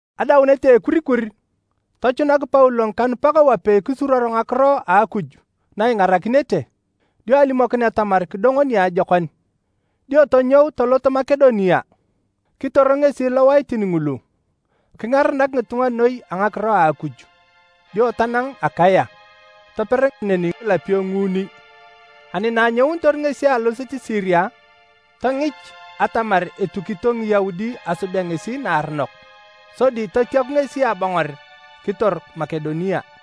Adaunet a ekurikur, tochunak Paulo ngikanupak wapei kisuruor ngakiro a Akuj na ingarakinete, dio alimokin atamar kidongo niajokon. Dio tonyou tolot Makedonia. Kitor ngesi lowaitin ngulu kingaranak ngitunga noi a ngakiro a Akuj. Dio tanang Akaya, toper neni ngilapio nguuni. Ani na anyounitor ngesi alosit Siria, tongich atamar etukito Ngiyaudi asubea ngesi naaronok. Sodi totiaku ngesi abongor kitor Makedonia.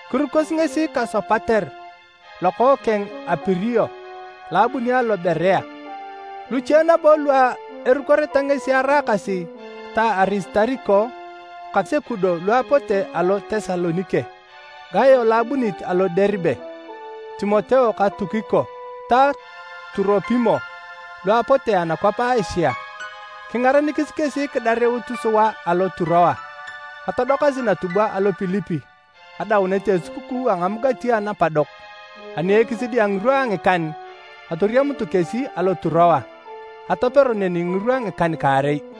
Kirukosi ngesi ka Sopater lokookeng a Pirio lo abuni alo Berea. Luche nabo lu erukoreta ngesi araakasi ta Arisitariko ka Sekudo lu apote alo Tesalonike, Gayo lo abunit alo Deribe, Timoteo ka Tukiko ta Turopimo lu apote anakwap a Asia. Kingarenikis kesi kidarut sua alo Turoa. Atodokasi natubwa alo Pilipi adaunet a esukukuu a Ngamugati Anapadok. Ani ekisidi a ngirwa a ngikan, atoriamutu kesi alo Turoa. Atopero neni ngirwa ngikan-kaarei.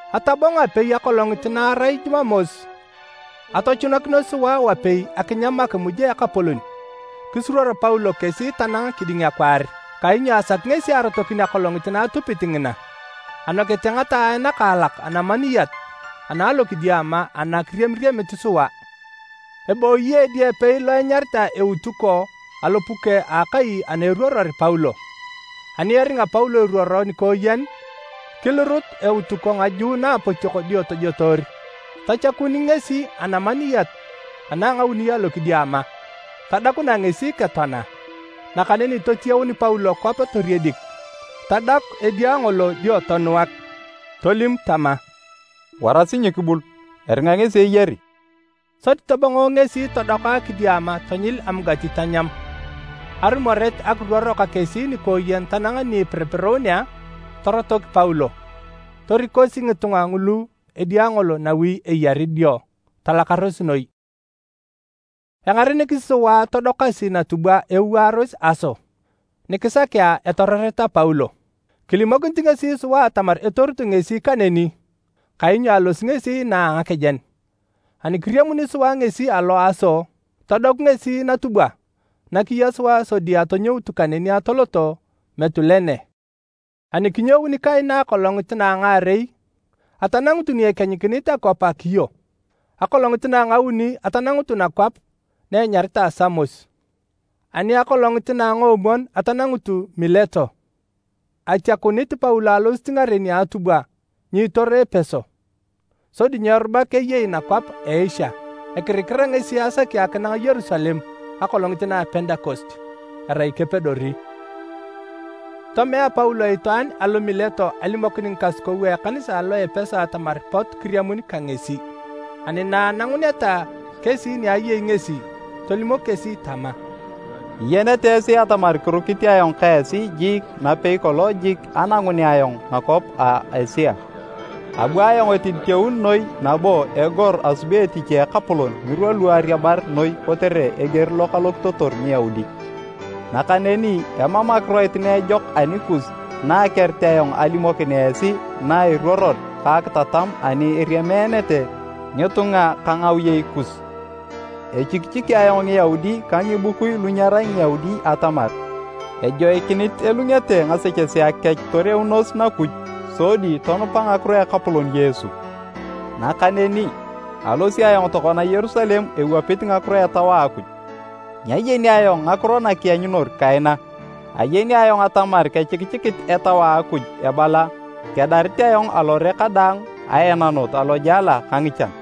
Atabong apei akolongit na arai Jumamos, Jumamos; kori Jumapili. atochunakinos sua wapei akinyam Akimuj a Ekapolon. Kisuruor Paulo kesi tanang kiding akwaar kainyo asaki ngesi arotokin akolongit na atupit ngina. Anokete ngataae nakaalak anamaniyat ana alokidiama ana kiriamiriamit sua. Ebooyi edia epei lo enyaritae Eutuko alopuke a akai ana eruoror Paulo. Ani eringa Paulo iruoro nikooyen, kilurut Eutuko ngaju naapotiok dio tojotoor. Tachakun ngesi anamaniyat ana a ngauni alokidiama. Tadakunae ngesi ketoana. Nakaneni totiyaun Paulo kwap toriedik, tadaku edia ngolo dio tonuak. Tolim tama, “Warasi nyikibul, eringa ngesi eyari!” Sodi tobongo ngesi todoka kidiama tonyil amugati tanyam. Arumoret akiruoro ka kesi nikooyen tanang ni ipiripirunea, torotok Paulo. Torikosi ngitunga ngulu edia ngolo nawi eyari dio, talakaros noi. Engarenikisi sua atodokasi natubwa ewaaros Aso, ni kisakea etororeta Paulo. Kilimokinit ngesi sua atamar etorutu ngesi kaneni, kainyo alosi ngesi inaa a ngakejen. Ani kiriamuni sua ngesi alo Aso, todoku ngesi natubwa na kiya sua sodi atonyoutu kaneni atoloto Mitulene. Ani kinyouni kaina akolongit na a ngaarei, atanangutu ni ekienyikinit akwap a Kio. Akolongit na a ngauni atanangutu nakwap na enyaritae Samos. Ani akolongit na a ngoomwon atanangutu Mileto. Atiakunit Paulo alosit ngaren a atubwa nyiitor Epeso, sodi nyeerubak eyei nakwap a Asia. Ekirikira ngesi asaki akinang Yerusalem akolongit na a Pentekost, erai kepedori. Tomea Paulo itwaan alo Mileto alimokin ngikasukou a ekanisa alo Epeso atamar pot kiriamun ka ngesi. Ani na ananguneta kesi ni ayei ngesi, tolimok kesi tama, “Iyenete esi atamar kirukit ayong ka esi jiik napei kolong jik anangunea ayong nakwap a Asia. Abu ayong etiditeun noi nabo egor asubi etich a Ekapolon ngirwa lu ariabar noi kotere eger lo kalokitotor Ngiyaudi. Nakaneni emam akiroit na ejok anikus na akerit ayong alimokin esi na eruoror ka akitatam ani eriameenete ngitunga ka ngawiyei kus. Echikichiki ayong Ngiyaudi ka ngibukui lu nyerai Ngiyaudi atamar ejoikinit elungete ngasechesea kech toreunos Nakuj sodi tonupa ngakiro a Ekapolon Yesu. Nakaneni, alosi ayong tokona Yerusalem ewapit ngakiro a Etau a Akuj. Nyayeni ayong ngakiro na kianyunor kaina. Ayeni ayong atamar kechikichikit Etau a Akuj ebala kedarit ayong alore kadaang aenanot alojela ka ngichan.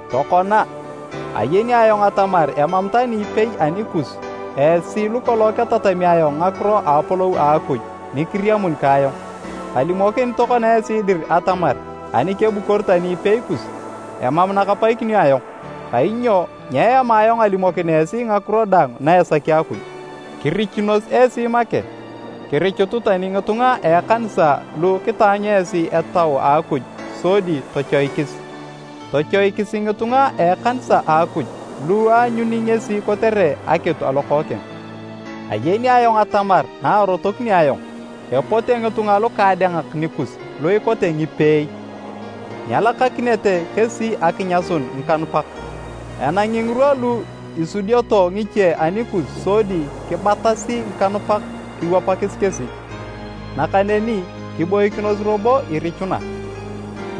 “Tokona, ayeni ayong atamar emam tani ipei anikus, esi lukolong ketatami ayong ngakiro a a apolou a Akuj ni kiriamun ka ayong. Kalimokinit tokona esi dir atamar ani kebukor tani ipei kus, emam na kapaikinio ayong. Kainyo nyeema ayong alimokin esi ngakiro daang na esaki Akuj. Kirichunos esi make. Kirichutu tani ngitunga a ekanisa lu kitaanyu esi Etau a Akuj sodi tochoikis. Tochoikisi ngitunga a ekanisa a Akuj lu aanyuni ngesi kotere akitu a Lokookeng. Ayeni ayong atamar na arotokinio ayong, epote ngitunga lukaadengak nikus lu ikote ngipeei. Nyelakakinete kesi akinyasun ngikanupak. Enangi ngirwa lu isudioto ngiche anikus sodi kibatasi ngikanupak kiwapakis kesi. Nakaneni kiboikinos robo irichuna,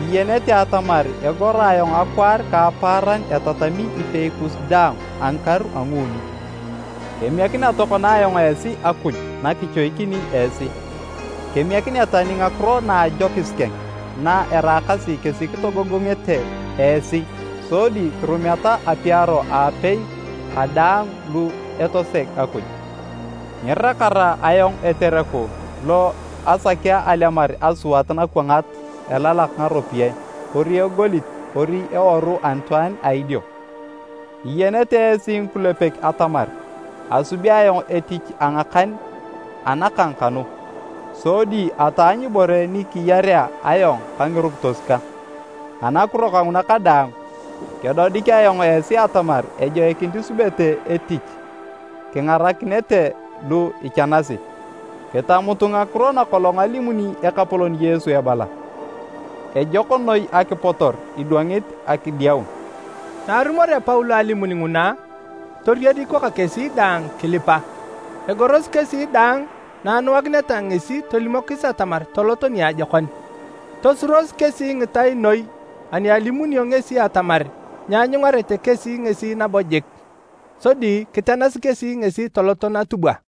iyenete atamar egoro ayong akwaar ka apaaran etatami ipei kus daang a ngikaru a nguuni. “Kemiekinea tokona ayong esi Akuj na kichoikini esi. Kemiekinea tani ngakiro na ajokis keng na eraakasi kesi kitogogongete esi sodi kirumeta apiaro aapei ka daang lu etoseg Akuj. Nyirakara ayong etereku lo asakea alemar asuat nakwangat elalak ngaropiyae kori egolit kori eworu anitwaan a idio. Iyenete esi ngikulepek atamar asubi ayong etich a ngakan anakang kanu, sodi ataanyu ibore ni kiyarea ayong ka ngirukitos kang. Anakiro kanguna kadaang, kedodik ayong esi atamar ejoikinit isubete etich kingarakineta lu ichanasi. Kitamutu ngakiro nakolong alimuni Ekapolon Yesu ebala, ‘Ejok noi akipotor idwangit akidiaun!’” Na arumorea Paulo alimun nguna, toriediko ka kesi daang kilipa. Egorosi kesi daang na anuakineta ngesi tolimokis atamar tolot niajokon. Tosuros kesi ngitai noi ani alimunio ngesi atamar nyeanyungarete kesi ngesi nabo jik. Sodi kitenasi kesi ngesi toloto natubwa.